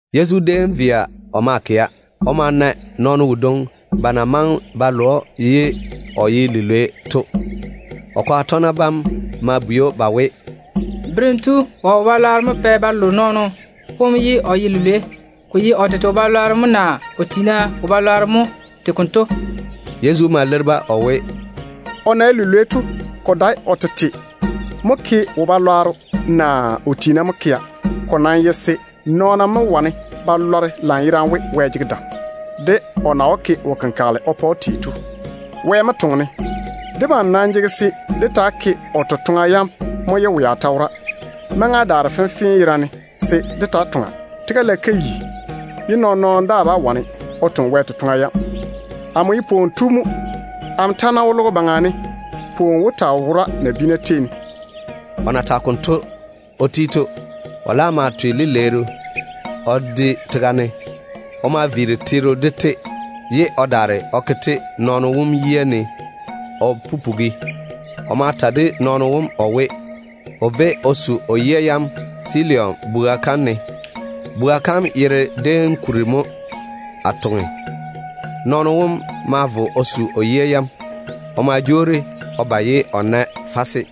Yezu déem ma vo o maa kɛa. O ma na nɔɔno wodwoŋi ba na maŋe ba lo‑o ye o ye lilwei. O kwaga tɔgena bam ma bwei‑o ba we, “Berem tu, wɔ keim-balwaaro mo pɛ ba lo nɔɔno wom ye o ye lilwei? Ko ye o tete keim-balwaaro mo naa o tiina keim-balwaaro mo tei konto?” Yezu ma leiri-ba o we, “O na ye lilwei to, ko dae o tete mo na ke wo-balwaaro naa o tiina mo na ke to ŋwaane. Ko nam ye se nɔɔna mo wane ba lɔre lanyerane we Wɛ jege dam, de o na wó ke wo-kenkagele o pa‑o tei to. Wɛ mo toŋe-ne. Debam nam jege se dé taa ke o totoŋa yam mo ye wea ta wora. Maŋa daare fenfee yerane se dé taa toŋa. Tega lage ka yi, ye nɔɔn-nɔɔno daa bá wane o toŋe Wɛ totoŋa yam. Amo ye pwooni tu mo. Amo ta ná wo logo baŋa ne, pwooni wó taa wo nabiina tei ne.” O na tage konto o ti to, o laam ma twe lileeru o de tega ne. O ma viiri teero de-te, ye o daare o ke-te nɔɔno wom yia ne o pupugi. O ma ta de nɔɔno wom o we, o véi o su o yia yam Siloam chɔgɔ kom ne. (Chɔgɔ kom yere dem kuri mo ‘Atoŋe’.) Nɔɔno wom ma vo o su o yia yam. O ma jwoori o ba ye o laam nae fase.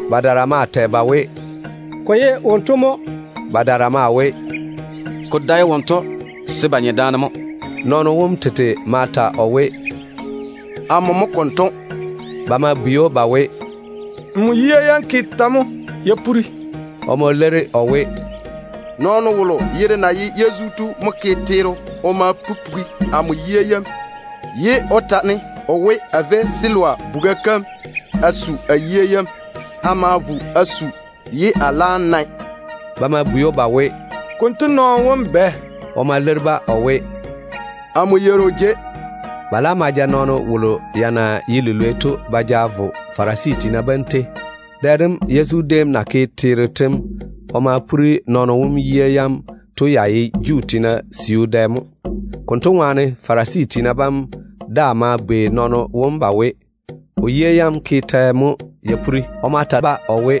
Badaara maa tɛ ba we, “Ko ye wonto mo.” Badaara maa we, “Ko dae wonto, se ba nye daane mo.” Nɔɔno wom tete ma ta o we, “Amo mo konto.” Ba ma bwei‑o ba we, “Nmo yia yam ke tɛ mo ya puri?” O ma leiri o we, “Nɔɔno wolo yere na ye Yezu to mo ke teero o ma pupugi amo yia yam, ye o ta-ne o we, a véi Siloam chɔgɔ kom a su a yia yam. A ma vo a su, ye a laam nae.” Ba ma bwei‑o ba we, “Konto nɔɔno wom bɛ?” O ma leiri-ba o we, “Amo yeiri o jei.” Ba laam ma ja nɔɔno wolo ya na ye lilwei to ba ja vo Farisi tiina bam tei. Dɛ dem Yezu déem na ke teero tem o ma puri nɔɔno wom yia yam to ya ye Juu tiina siu dɛ mo. Konto ŋwaane Farisi tiina bam daa ma bwei nɔɔno wom ba we, o yia yam ke tɛ mo ya puri? O ma ta-ba o we,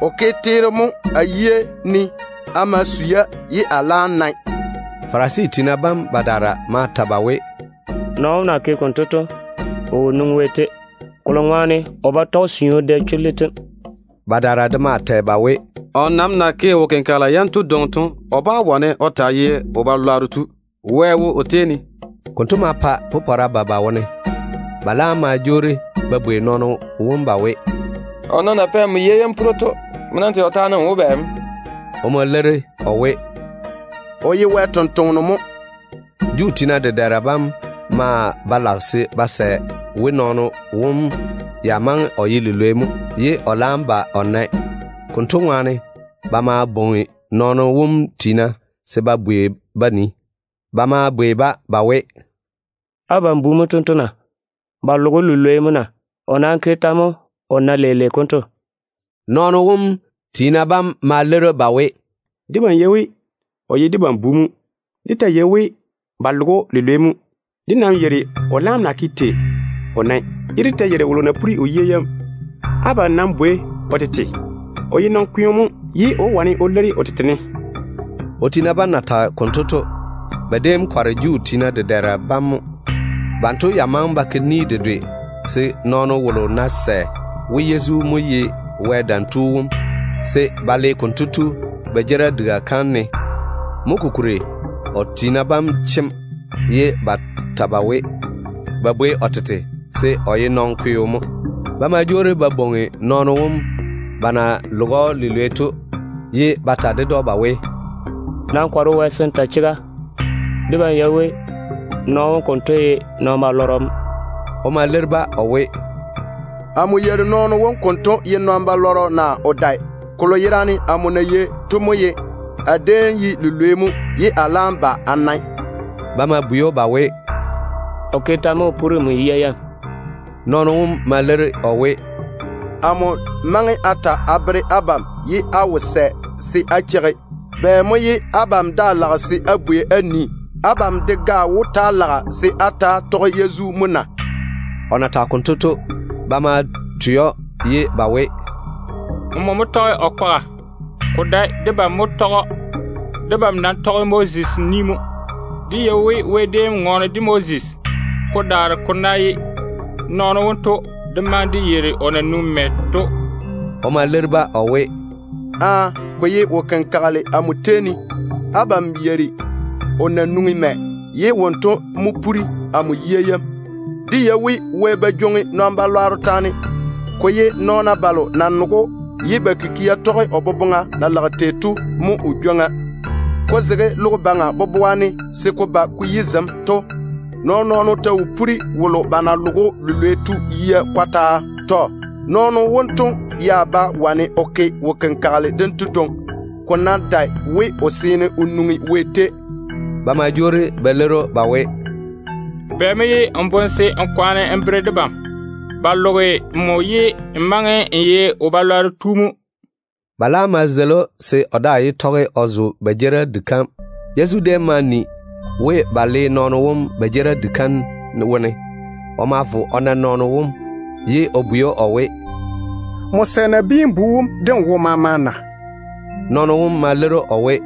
“O ke teero mo a yia ne. A ma su-ya, ye a laam nae.” Farisi tiina bam badaara ma ta ba we, “Nɔɔno wom na ke konto to, o wo nwoŋi Wɛ tei, kolo ŋwaane o ba tɔge siu dɛ chullu tem.” Badaara de maa tɛ ba we, “O nam na ke wo-kenkagela yanto dwoŋi to, o bá wane o taa ye nɔn-chechɔgero. Wɛ mo wo o tei ne.” Konto ma pa popɔra ba ba wone. Ba laam ma jwoori ba bwei nɔɔno wom ba we, “O nam na pɛ nmo yia yam puri to, nmo nam tɛ o taane n we bɛ mo?” O ma leiri o we, “O ye Wɛ ni-jwoŋinu mo.” Juu tiina dedɛɛra bam maa ba lage se ba sɛ we nɔɔno wom ya maŋe o ye lilwei mo, ye o laam ba o nae. Konto ŋwaane, ba ma bwoŋi nɔɔno wom tiina se ba bwei ba nii. Ba ma bwei-ba ba we, “Abam bu mo tento na? Ba loge‑o lilwei mo na? O nam ke tɛ mo o nae leile konto?” Nɔɔno wom tiina bam ma leiri ba we, “Debam yei we o ye debam bu mo. Dé ta yei we ba loge‑o lilwei mo. Dé nam yeiri o laam na ke tei o nae, ye dé ta yeiri wolo na puri o yia yam. Abam nam bwei-na o tete, se o ye nɔn-kweo mo. O tete wó wane o leiri abam.” O tiina bam na tage konto to, ba déem kɔre Juu tiina dedɛɛra bam mo. Banto ya maŋe ba ke ni dedwe se nɔɔno wolo ná sɛ we Yezu mo ye Wɛ Dam Tu wom, se ba le konto tu ba jeerim diga kam ne. Mo kokuri o tiina bam chem, ye ba ta ba we, ba nam bwei nɔɔno wom tete, se o ye nɔn-kweo mo. Ba ma jwoori ba bwoŋi nɔɔno wom ba na loge‑o lilwei to, ye ba ta ded‑o ba we, “Nam kɔre Wɛ se n ta chega. Debam yei we nɔɔno wom konto ye nɔn-chechɔgɔ mo.” O ma leiri-ba o we, “Amo yeiri nɔɔno wom konto ye nɔn-chechɔgɔ naa o dae. Kolo yerane amo na yei to mo ye a déem ye lilwei mo, ye a laam ba a nae.” Ba ma bwei‑o ba we, “O ke tɛ mo o puri nmo yia yam?” O ma leiri o we, “Amo maŋe a ta a bere abam, ye á wo sɛ se á cheigi. Bɛ mo ye abam daa lage se á bwei á nii? Abam de ga wó ta‑á lage se á ta‑á tɔge nɔɔno wom kwaga mo na?” O na tage konto to, ba ma twe‑o ye ba we, “Ko ye nmo mo tɔge o kwaga. Ko dae debam mo tɔge‑o. Debam nam tɔge Moses bera yam mo. Dé yei we Wɛ déem ŋɔɔne de Moses. Ko daare ko ná ye nɔɔno wonto, dé maŋe dé yeiri o na nwoŋi mɛ to.” O ma leiri-ba o we, “Aaa. Ko ye kolo na tiini ko so amo to mo! Abam yeiri o na nwoŋi mɛ, ye wonto mo puri amo yia yam. Dé yei we Wɛ ba jwoŋi nɔn-chechɔgero taane. Ko ye nɔɔna balo na nege‑o ye ba kikia tɔge o boboŋa na lage tei to mo o jwoŋa. Ko zege logo baŋa boboa ne se ko ba ko yi zem to, nɔɔn-nɔɔno ta wo puri wolo ba na loge‑o lilwei to yia kɔtaa. Nɔɔno wonto ya bá wane o ke wo-kenkagele dento dwoŋi, ko ná dae we o seene o nwoŋi Wɛ tei.” Ba ma jwoori ba leiri‑o ba we, “Bɛ mo ye n boŋe se n kwaane n bere debam? Ba loge nmo ye n maŋe n ye wo-balwaaro tu mo.” Ba laam ma zeili‑o se o daa yé tɔge o zo ba jeerim diga kam. Yezu déem ma ni we ba le nɔɔno wom ba jeerim diga kam wone. O ma vo o beeri nɔɔno wom. O na nɛ‑o to, o ma bwei‑o o we, “Nmo sɛ Nabiin-bu wom de n wo maama na?” Nɔɔno wom ma leiri o we,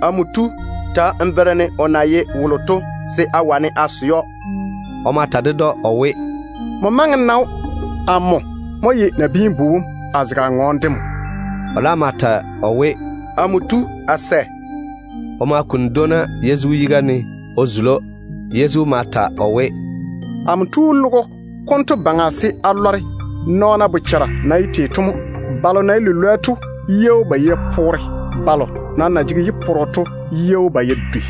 “Amo tu, ta n bere-ne o na ye wolo to, se a wane a sɛ‑o.” Yezu ma ta ded‑o o we, “Nmo maŋe n na‑o. Amo mo ye Nabiin-bu wom, a zege a ŋɔɔne de nmo.” O laam ma ta o we, “Amo tu, a sɛ.” O ma kuni dwoona Yezu yiga ne o zuli‑o. Yezu ma ta o we, “Amo tu logo konto baŋa se a pɔɔre nɔɔna daane de ba bochara na ye tei to mo. Balo na ye lilwoa to yia wó ba ya puri. Balo nam na jege yi-poro to yia wó ba ya dwei.”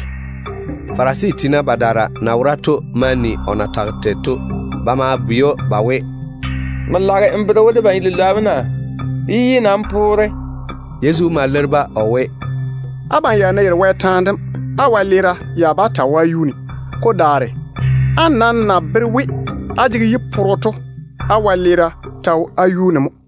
Farisi tiina badaara na wora to ma ni o na tage tei to. Ba ma bwei‑o ba we, “Nmo lage n bere we debam ye lilwoa mo na? Dé yi nam poore.” Yezu ma leiri-ba o we, “Abam ya ná ye lilwoa Wɛ chega kam seeni, á wɛleera ya bá taa wo á yuu ne. Ko daare, á nam na bere we á jege yi-poro to, á wɛleera ta wo á yuu ne mo.”